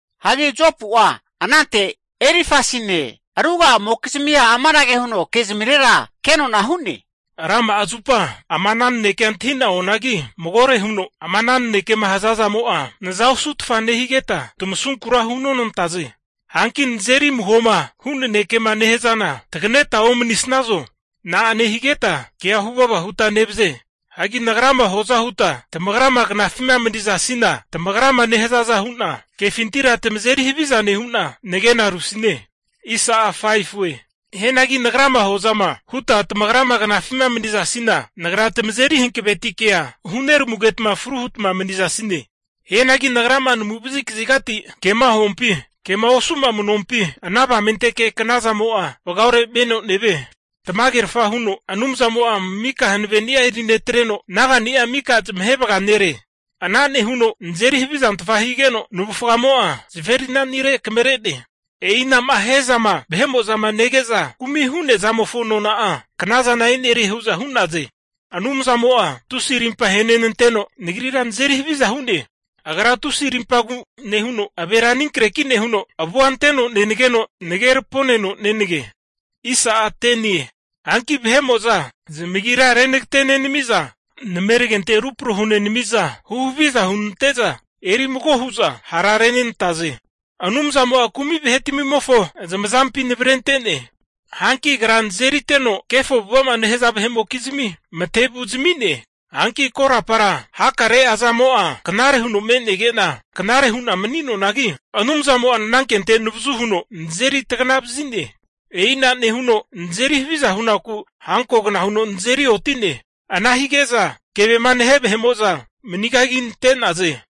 Hagi Jopu'a anante Elifasine ruga'amokizmia amanage huno kezmirera kenona hu'ne, Rama'a zupa ama ana nanekea antahi'na oanagi, magore huno ama ana nanekema hazazamo'a naza osutfa nehigeta tamasunkura hunonantaze. Hanki nazeri amuhoma hu nanekema nehazana taganeta omanigahazo? Na'a nehigeta kea huvava huta nevaze? Hanki nagrama huaza huta tamagrama knafima manizasina, tamagrama nehazaza hu'na kefintira tamazeri haviza nehu'na nagena rusine. Hianagi nagrama huazama huta tamagra knafima manizasina, nagra tamazeri hanavetikea huneramugetma fru hutma manizasine. Hianagi nagra'ama naguvazi kazigati kema huampi, kema osu'ma manuampi, ana avamenteke knazanimo'a vagaore meno nevie. Tamagerfa huno Anumzamo'a mika hanaveni'a erinetreno, naga'ni'a mika zamahe vaganere. Ana nehuno nazeri havizantfa higeno, navufgamo'a zaferina'nire akamare'ne. E'ina'ma hia zama vahe'mo'zama nege'za kumi hu'nea zamofo nona'a knazana e'nerie hu'za hu'naze. Anumzamo'a tusi arimpa ahenenanteno nagrira nazeri haviza hu'ne. Agra tusi rimpagu nehuno avera aninkreki nehuno, avua anteno nenageno nage raponeno nenage. Hanki vahe'mo'za zamagira renagate nenamiza, nameragente rupro hunenamiza, huhaviza hunante'za eri mago hu'za ha'rarenante'naze. Anumzamo'a kumi vahetmimofo zamazampi navrente'ne. Hanki Agra nazeriteno kefo avu'ava'ma nehaza vahe'mokizmi matevu zami'ne. Hanki korapara hakare'a zamo'a knare huno me'nege'na knare hu'na mani'noanagi, Anumzamo'a nanankente navazu huno nazeri taganavazi'ne. E'ina nehuno nazeri haviza hunaku hankogna huno nazeri oti'ne. Ana hige'za kevema nahe vahe'mo'za manigaginante'naze.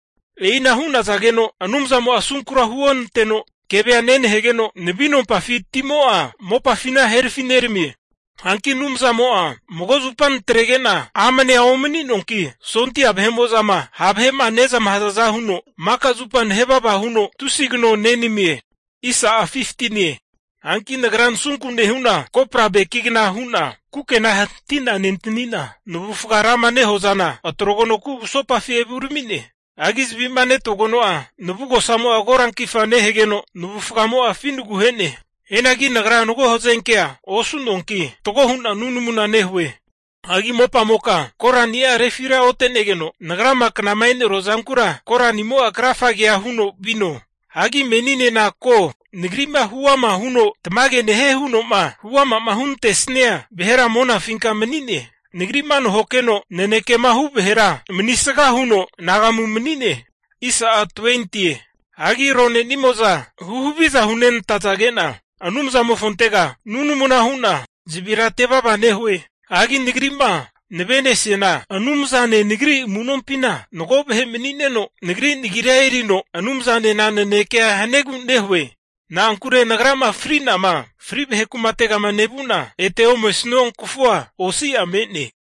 E'ina hu'nazageno Anumzamo'a asunkura huonanteno kevea nenahegeno, navinompafi timo'a mopafina herafi neramie. Hanki Anumzamo'a mago zupa natrege'na amnea omani'noanki, sondia vahe'mo'zama ha' vahe'ma nezmahazaza huno maka zupa naheva naheva huno tusi kano nenamie. Hagi nagra nasunku nehu'na kopra beki kukena hati'na nentanina, navufga rama nehua zana atrogeno kugusopafi evurami'ne. Hagi zavi'ma netogeno'a, navugosamo'a korankifa nehegeno, navumo'a finigu ahe'ne. Hianagi nagra mago hazenkea osu'noanki, fatgo hu'na nunamuna nehue. Hagi mopamoka korani'a refira otenegeno, nagrama knama enerua zankura koranimo'a krafagea huno vino. Hagi meninena ko, nagri'ma huama'ma huno tamage nehie huno'ma huama'ma hunantesia vahera monafinka mani'ne. Nagri'ma nahokeno nanekema hu' vahera manisga huno anagamu mani'ne. Hagi aronenimo'za huhaviza hunenantazage'na Anumzanimofontega nunamuna hu'na zavira atevava nehue. Hagi nagri'ma navenesiana Anumzane nagri amu'nompina mago vahe mani'neno nagri nagira erino Anumzanena nanekea haniegu nehue. Na'ankure nagrama fri'nama fri vahe kumategama nevuna, ete omesua kafua osi'a me'ne.